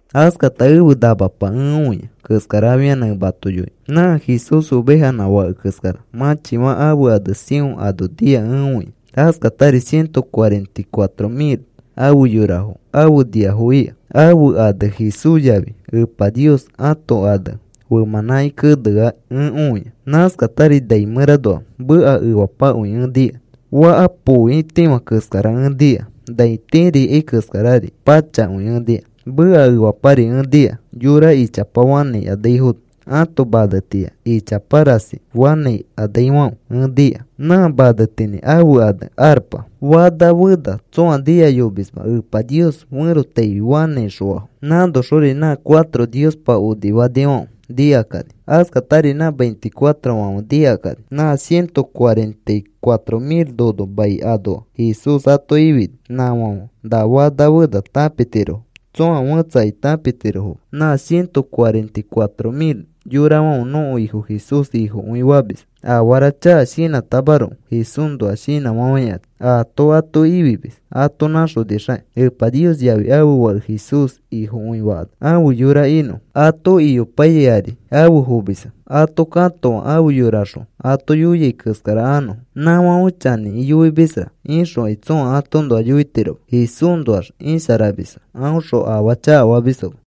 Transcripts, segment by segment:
Askata ẽfe namapa ẽ õia keskara afianã ẽ mato yoinõ. Nã Jesús ovejanã fake keskara mãchifã ãfe ane Sión ano nia ẽ õia. Askatari ciento cuarenta y cuatro mil afe yorafo afe niafo ika. Ãfe ane Jesús yafi Epa Nios ãto ane femãnãki kenea ẽ õia. Nãskatari nai mẽranoa meka efapakõi ẽ nika. Faka põoitifã keskara ẽ nika, nai tiri ikai keskarari pachakõi ẽ nika. Meka efapari ẽ nika yora ichapa fanãikanaifono ãto manetiya ichapa rasi fanãikanaifãfe ẽ nika. Nã manetinĩ ãfe ane arpa. Fana fena tsõa nikayomisma Epa Nios ferotaifi fanãixõafo. Nãnoxori nã cuatro Niospa onifanifãfe nikakani. Askatari nã veinticuatrofãfe nikakani. Nã ciento cuarenta y cuatro mil nono mai anoa Jesús ato ifini, nãfãfe na fana fena tãpitirofo. Tsoa fẽtsakai tãpitirofoma. Nã ciento cuarenta y cuatro mil yorafãfe nõko Ifo Jesús Ifokõi famisfo. Afara chaka shinãtamaroko Jesúsnoa shinãfafãikani. Aato ato ifimis ato nãxonixakĩ Epa Nios yafi ãfe Fake Jesús Ifokõi fakanax ãfe yora inõfo. Ato iyopaiyai ari afe fomisfo. Ato katoa afe yorakaxõ ato yoiai keskara anõfo. “Nãfãfe chanĩkĩ yoimisra,” ixõkai tsõa atoõnoa yoitiroma. Jesúsnoax isharamisfo. Aõxõ afaa chakafamisfoma.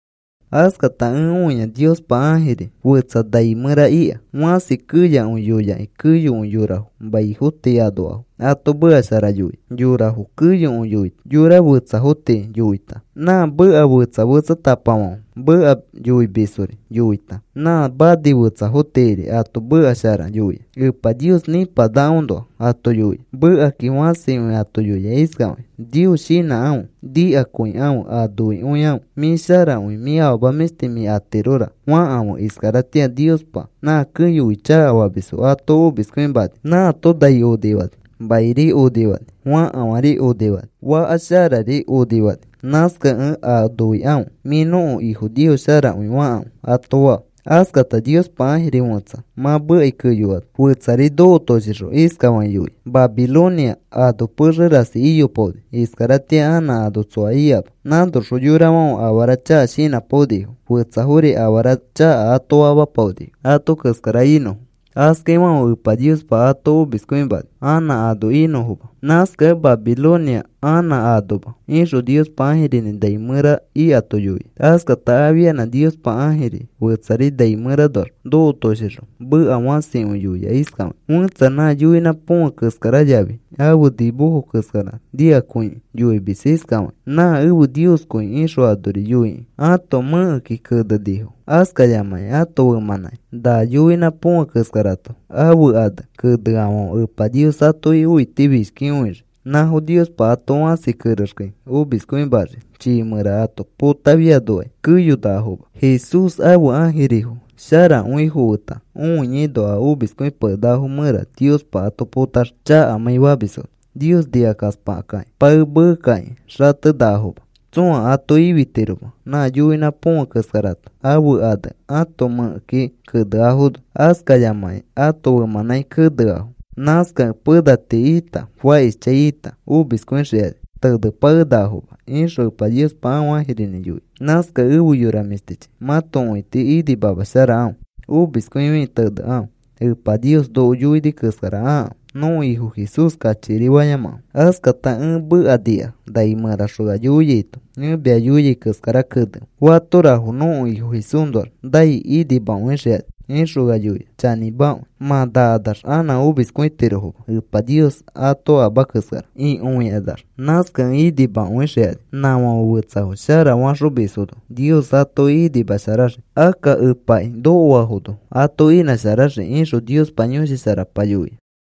Askata ẽ õia Niospa ãjiri fẽtsa nai mẽra ika fãsi keyakõi yoyakĩ keyokõi yorafo maifo tii anoafo ato meka shara yoia. Yorafo keyokõi yoita, xoko fetsafo tii yoita, nã meka fetsa fetsatapafãfe meka yoimisfori yoita, nã mani fetsafo tiiri ato meka shara yoia. Epa Nios nipanakaõnoa ato yoia. Mekakĩ fãsikõi ato yoia iskafakĩ: “Nios shinãkãfe. Nikakõikãfe. A noikõikãfe. ‘Mĩ sharakõi, mĩ afama mĩshti mĩ atirora,’ fakãfe. Iskaratĩa Niospa nã keyokõi chakafamisfo ato omiskõimani. Nãato nai onifani, mairi onifani, fakafãri onifani, faka sharari onifani. Nãskakẽ a noikãfe: ‘Mĩ nõko Ifo Nios sharakõi,’ fakãfe,” ato faa. Askata Niospa ãjiri fẽtsa mã mekai keyoano fetsari nokotoshixõ iskafakĩ yoia: “Babilonia ano pexe rasi iyopaoni. Iskaratĩa anã ano tsoa ikama. Nãnoxõ yorafãfe afara chaka shinãpaonifo. Fetsafori afara chaka ato famapaonifo ato keskara inõfo. Askaifãfe Epa Niospa ato omiskõimani anã ano inõfoma. Nãskakẽ Babilonia anã anoma,” ixõ Niospa ãjirinĩ nai mẽra ikato yoia. Askata afianã Niospa ãjiri fetsari nai mẽranoax nokotoshixõ meka fãsikõi yoia iskafakĩ: “Fẽtsa nã yoinã põfe keskara yafi ãfe nimofo keskara nikakõikĩ yoimis iskafakĩ: ‘Nã ẽfe nioskõi,’ ixõ anori yoikĩ ãto mẽkeki kenenifo, askayamakĩ ãto femãnãki na yoinã põfe keskarato ãfe ane keneafãfe Epa Nios atoki õitifishkikõixii. Nãfo Niospa ato fãsi kerexkai omiskõimaxii. Chii mẽra ato potafianokai keyonakafoma. Jesús ãfe ãjirifo sharakõifo feta õiaino a omiskõipakenakafo mẽra Niospa ato potaxii chakamãi famisfono, Nios nikakaspakakĩ. Pae meekakĩ xatenakafoma. Tsõa ato ifitiroma, nã yoinã põfe keskarato ãfe ane ãto mẽkeki keneafono, askayamakĩ ato femãnãki keneafo. Nãskakẽ pena tii ita, fakishchãi ita, omiskõixikani tenepakenakafoma,” ixõ Epa Niospa ãfe ãjirinĩ yoia. Nãskakẽ efe yora mĩshtichi, mãto õiti inimamasharakãfe. Omiskõifikĩ tenekãfe. Niospa noko yoini keskara akãfe. Nõko Ifo Jesús kachikiri fayamakãfe. Askata ẽ meka nika nai mẽraxõ ea yoiaito: “Ẽ mia yoiai keskara kenefe. Fatorafo nõko Ifo Jesúsnoax nai, inimakõixikani,” ixõ ea yoia. “Chanĩmakõi. Mã nakanax anã omiskõitirofoma. Epa Niospa ato ama keskara akõikanax, nãskakẽ inimakõixikani. Nãfãfe fetsafo shara faxomisfono Nios atoki inimasharaxii. Akka Epaki nokoafono ato inãsharaxii,” ixõ Niospa Yõshi Sharapa yoia.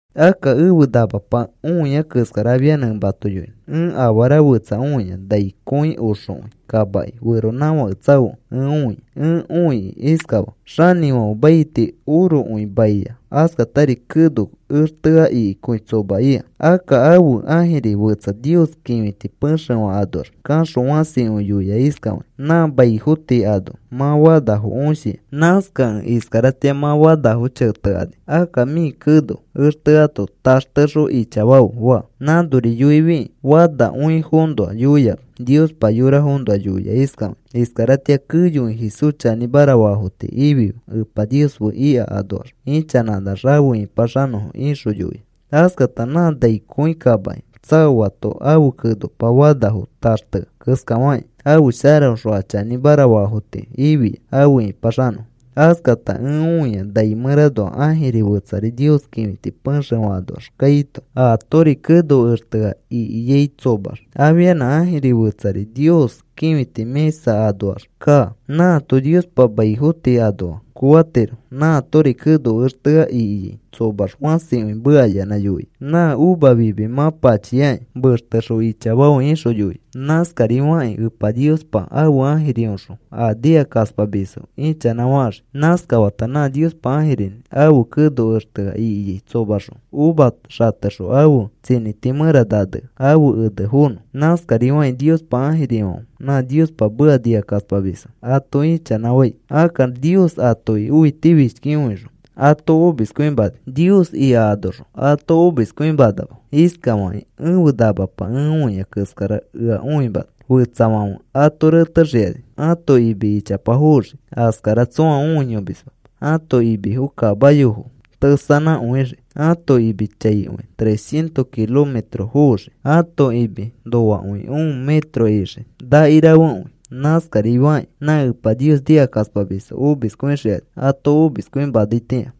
Akka ẽfe namapa õia keskara afianã ẽ mato yoinõ. Ẽ afara fetsa õia nai kõi oxokõi kamaki feronãfake tsaokẽ ẽ õia. Ẽ õikĩ iskafaa: Xanĩfãfe maiti orokõi maiya, askatari keno extea ikikõi tsoma ika. Akka ãfe ãjiri fetsa Nios kĩfiti pexefã anoax kaxõ fãsikõi yoia iskafakĩ: “Nã maifo tii ano mã fanafo õshia. Nãskakẽ iskaratĩa mã fanafo chetekani. Akka mĩ keno exteato taxtexõ ichafafe,” faa. Nãnori yoifikĩ fanakõifoõnoa yoiama. Niospa yorafoõnoa yoia iskafakĩ: “Iskaratĩa keyokõi Jesús chanĩmara faafo tii ifife Epa Nios fe ika anoax ichanãkanax afe ĩpaxanõfo,” ixõ yoia. Askata nã nai kõi kamaki tsaoato ãfe kenopa fanafo taxtea keskafakĩ ãfe sharaõxõ a chanĩmara faafo tii ifia afe ĩpaxanõfo. Askata ẽ õia nai mẽranoa ãjiri fetsari Nios kĩfiti pexefã anoax kaito, aatori keno extea ikiai tsomax. Afianã ãjiri fetsari Nios kĩfiti mĩsa anoax kaa. Nãato Niospa maifo tii anoa koatiro. Nãatori keno extea ikiai tsomax fãsikõi mekayanã yoia: “Nã uva fimi mã pachiaki. Mextexõ ichafafe,” ixõ yoia. Nãskarifakĩ Epa Niospa ãfe ãjiriõxõ a nikakaspamisfo ichanãfaxii. Nãskata nã Niospa ãjirinĩ ãfe keno extea ikiai tsomaxõ uva xatexõ ãfe tsinĩti mẽra nanea ãfe ene fonõ. Nãskarifakĩ Niospa ãjirifãfe nã Niospa meka nikakaspamisfo ato ichanãfai. Akka Nios atoki õitifishkikõixõ ato omiskõimani. Nios ika anoxõ ato omiskõimanama. Iskafakĩ ẽfe namapa ẽ õiai keskara ea õimana. Fetsafãfe ato retexikani ãto imi ichapa foxii. Askara tsõa õiyomisma. Ãto imifo kamayofo tesanãkõixii. Ãto imi chaikõi trescientos kilometros foxii. Ato imi noakõi un metro ixii, nakirafekõi. Nãskarifakĩ nã Epa Nios nikakaspamisfo omiskõixikani ato omiskõimanaitĩa.